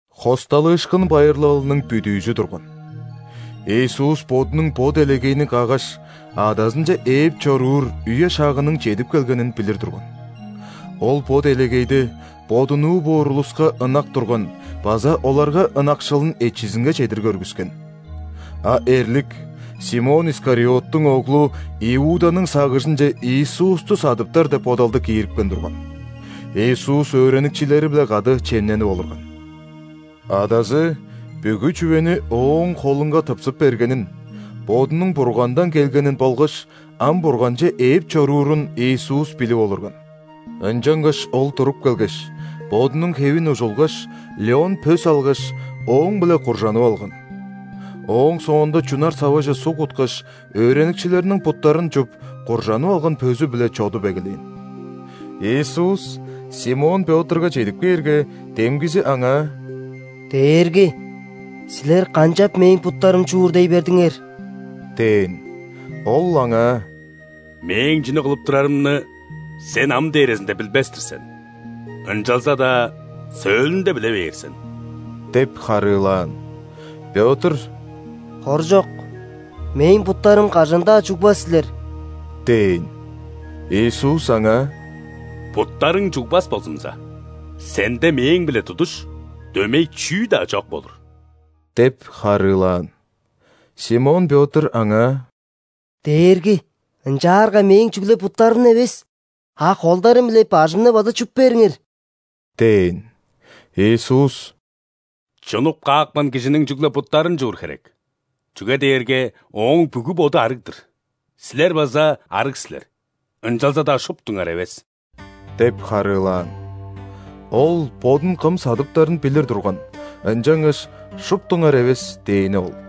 ·Хосталыышкын байырлалының бүдүүзү турган. Иисус Бодунуң бо делегейни каггаш, Адазынче ээп чоруур үе-шагының чедип келгенин билир турган. Ол бо делегейде Бодунуу боор улуска ынак турган база оларга ынакшылын эчизинге чедир көргүскен. А эрлик Симон Искариоттуң оглу Иуданың сагыжынче Иисусту садыптар деп бодалды киирипкен турган. Иисус өөреникчилери-биле кады чемненип олурган. Адазы бүгү чүвени Ооң холунга тыпсып бергенин, Бодунуң Бургандан келгенин болгаш ам Бурганче ээп чоруурун Иисус билип олурган. Ынчангаш Ол туруп келгеш, Бодунуң хевин ужулгаш, лён пөс алгаш, ооң-биле куржанып алган. Ооң соонда чунар саваже суг куткаш, өөреникчилериниң буттарын чуп, куржанып алган пөзү-биле чодуп эгелээн. Иисус Симон Пётрга чедип кээрге, демгизи Аңаа: «Дээрги! Силер канчап мээң буттарым чуур дей бердиңер?» – дээн. Ол аңаа: «Мээң чүнү кылып турарымны сен ам дээрезинде билбес-тир сен, ынчалза-даа сөөлүнде биле бээр сен» – деп харыылаан. Пётр: «Хоржок! Мээң буттарым кажан-даа чугбас силер!» – дээн. Иисус аңаа: «Буттарың чугбас болзумза, сенде Мээң-биле тудуш, дөмей чүү-даа чок болур» – деп харыылаан. Симон Пётр Аңаа: «Дээрги! Ынчаарга мээң чүгле буттарымны эвес, а холдарым биле бажымны база чуп бериңер!» – дээн. Иисус: «Чунуп каапкан кижиниң чүгле буттарын чуур херек, чүге дээрге ооң бүгү боду арыг-дыр. Силер база арыг силер, ынчалза-даа шуптуңар эвес» – деп харыылаан. Ол Бодун кым садыптарын билир турган, ынчангаш: «Шуптуңар эвес» – дээни ол.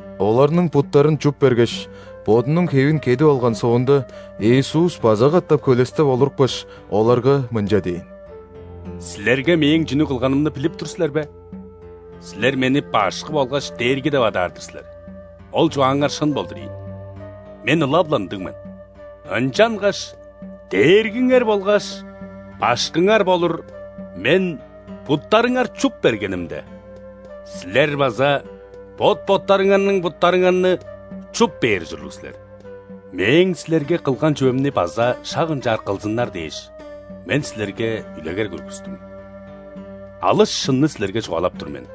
Оларның буттарын чуп бергеш, Бодунуң хевин кедип алган соонда, Иисус база катап хөлестеп олурупкаш, оларга мынча дээн: «Силерге Мээң чүнү кылганымны билип тур силер бе? Силер Мени Башкы болгаш Дээрги деп адаар-дыр силер, ол чугааңар шын болдур ийин – Мен ылап-ла ындыг мен. Ынчангаш Дээргиңер болгаш Башкыңар болур Мен буттарыңар чуп бергенимде, силер база бот-боттарыңарның буттарыңарны чуп бээр ужурлуг силер. Мээң силерге кылган чүвемни база шак ынчаар кылзыннар дээш, Мен силерге үлегер көргүстүм. Алыс шынны силерге чугаалап тур мен: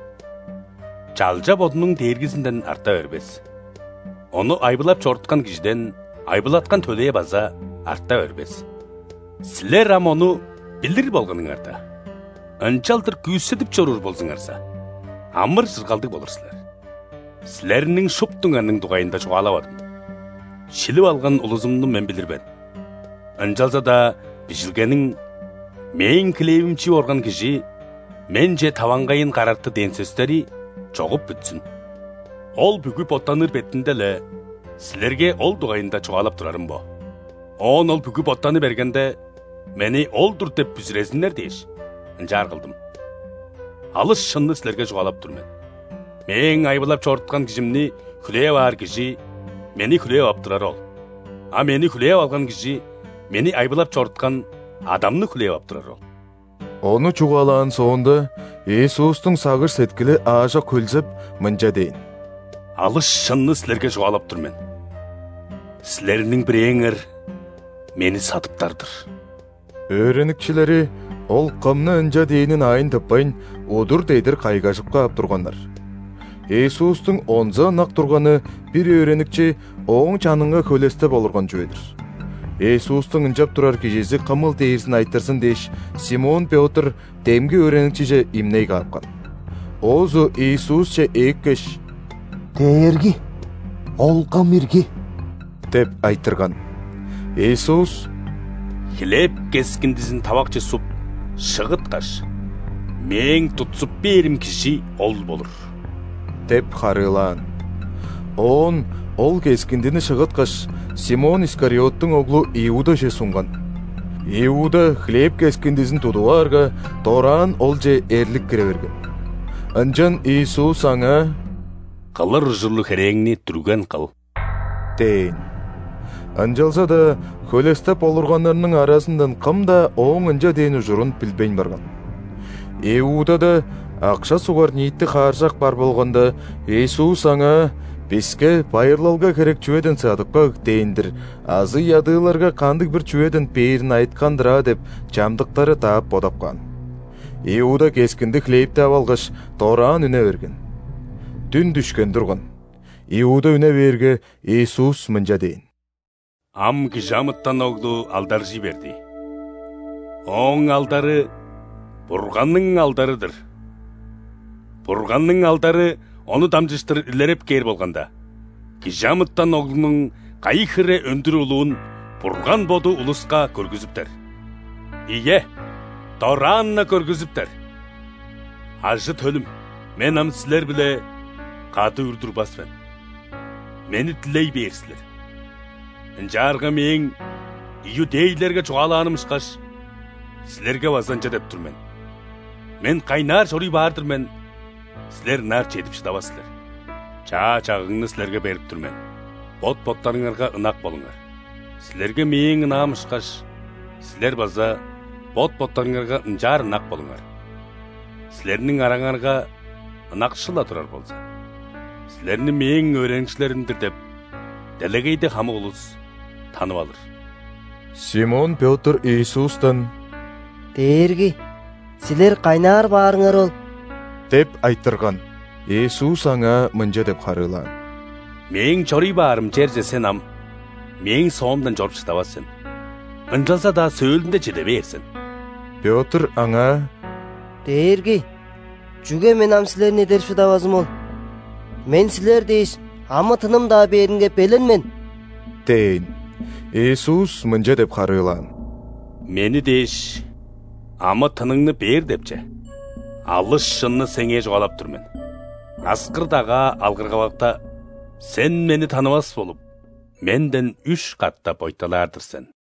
чалча бодунуң дээргизинден арта бербес, ону айбылап чоруткан кижиден айбылаткан төлээ база арта бербес. Силер ам ону билир болганыңарда, ынчалдыр күүседип чоруур болзуңарза, амыр-чыргалдыг болур силер». «Силерниң шуптуңарның дугайында чугаалавадым: шилип алган улузумну Мен билир мен. Ынчалза-даа Бижилгениң: „Мээң хлевим чип орган кижи Менче таваңгайын карарты“ дээн сөстери чогуп бүтсүн. Ол бүгү боттаныр бетинде-ле, силерге ол дугайында чугаалап турарым бо. Оон ол бүгү боттаны бергенде, Мени Ол-дур деп бүзүрезиннер дээш, ынчаар кылдым. Алыс шынны силерге чугаалап тур мен: Мээң айбылап чоруткан кижимни хүлээп аар кижи Мени хүлээп ап турары ол, а Мени хүлээп алган кижи Мени айбылап чоруткан Адамны хүлээп ап турары ол». Ону чугаалаан соонда, Иисустуң сагыш-сеткили аажок хөлзеп, мынча дээн: «Алыс шынны силерге чугаалап тур мен: силерниң бирээңер Мени садыптар-дыр». Өөреникчилери Ол кымны ынча дээнин аайын тыппайн, удур-дедир кайгажып каап турганнар. Иисустуң онза ынак турганы бир өөреникчи Ооң чанынга хөлестеп олурган чүве-дир. Иисустуң ынчап турар кижизи кымыл дээрзин айтырзын дээш, Симон Пётр демги өөреникчиже имней каапкан. Оозу Иисусче ээккеш: «Дээрги! Ол кым ирги?» – деп айтырган. Иисус: «Хлеб кескиндизин тавакче суп, шыгыткаш, Мээң тутсуп бээрим кижи ол болур» – деп харыылаан. Оон Ол кескиндини шыгыткаш, Симон Искариоттуң оглу Иудаже сунган. Иуда хлеб кескиндизин тудуп аарга, дораан олче эрлик кире берген. Ынчан Иисус аңаа: «Кылыр ужурлуг херээңни дүрген кыл» – дээн. Ынчалза-даа хөлестеп олурганнарның аразындан кым-даа Ооң ынча дээн ужурун билбейн барган. Иудада акша сугар ниити хааржак бар болганда, Иисус аңаа: «Биске байырлалга херек чүведен садып каг» – дээн-дир азы ядыыларга кандыг-бир чүведен бээрин айыткан-дыр аа деп, чамдыктары даап бодап каан. Иуда кескинди хлебти ап алгаш, дораан үне берген. Дүн дүшкен турган. Иуда үне бээрге, Иисус мынча дээн: «Ам ·Кижи амытан Оглу алдаржый берди. Ооң алдары – Бурганның алдары-дыр. Бурганның алдары Ону дамчыштыр илереп кээр болганда, Кижи амытан Оглунуң кайы хире өндүр улуун Бурган Боду улуска көргүзүптер. Ийе, дораан-на көргүзүптер. Ажы-төлүм! Мен ам силер-биле кады үр турбас мен. Мени дилей бээр силер, ынчаарга Мээң иудейлерге чугаалааным ышкаш, силерге база ынча деп тур мен: Мен кайнаар чоруй баар-дыр мен, силер ынаар чедип шыдавас силер. Чаа чагыгны силерге берип тур мен: бот-боттарыңарга ынак болуңар. Силерге Мээң ынаам ышкаш, силер база бот-боттарыңарга ынчаар ынак болуңар. Силерниң араңарга ынакшыл-ла турар болза, силерни Мээң өөреникчилерим-дир деп делегейде хамык улус танып алыр». Симон Пётр Иисустан: «Дээрги! Силер кайнаар баарыңар ол?» – деп айтырган. Иисус аңаа мынча деп харыылаан: «Мээң чоруй баарым черже сен ам Мээң соомдан чоруп шыдавас сен. Ынчалза-даа сөөлүнде чеде бээр сен». Пётр Аңаа: «Дээрги! Чүге мен ам Силерни эдерип шыдавазым ол? Мен Силер дээш, амы-тыным-даа бээринге белен мен!» – дээн. Иисус мынча деп харыылаан: «Мени дээш, амы-тыныңны бээр деп че? Алыс шынны сеңээ чугаалап тур мен: аскыр-дагаа алгыргалакта, сен Мени танывас болуп, Менден үш катап ойталаар-дыр сен!»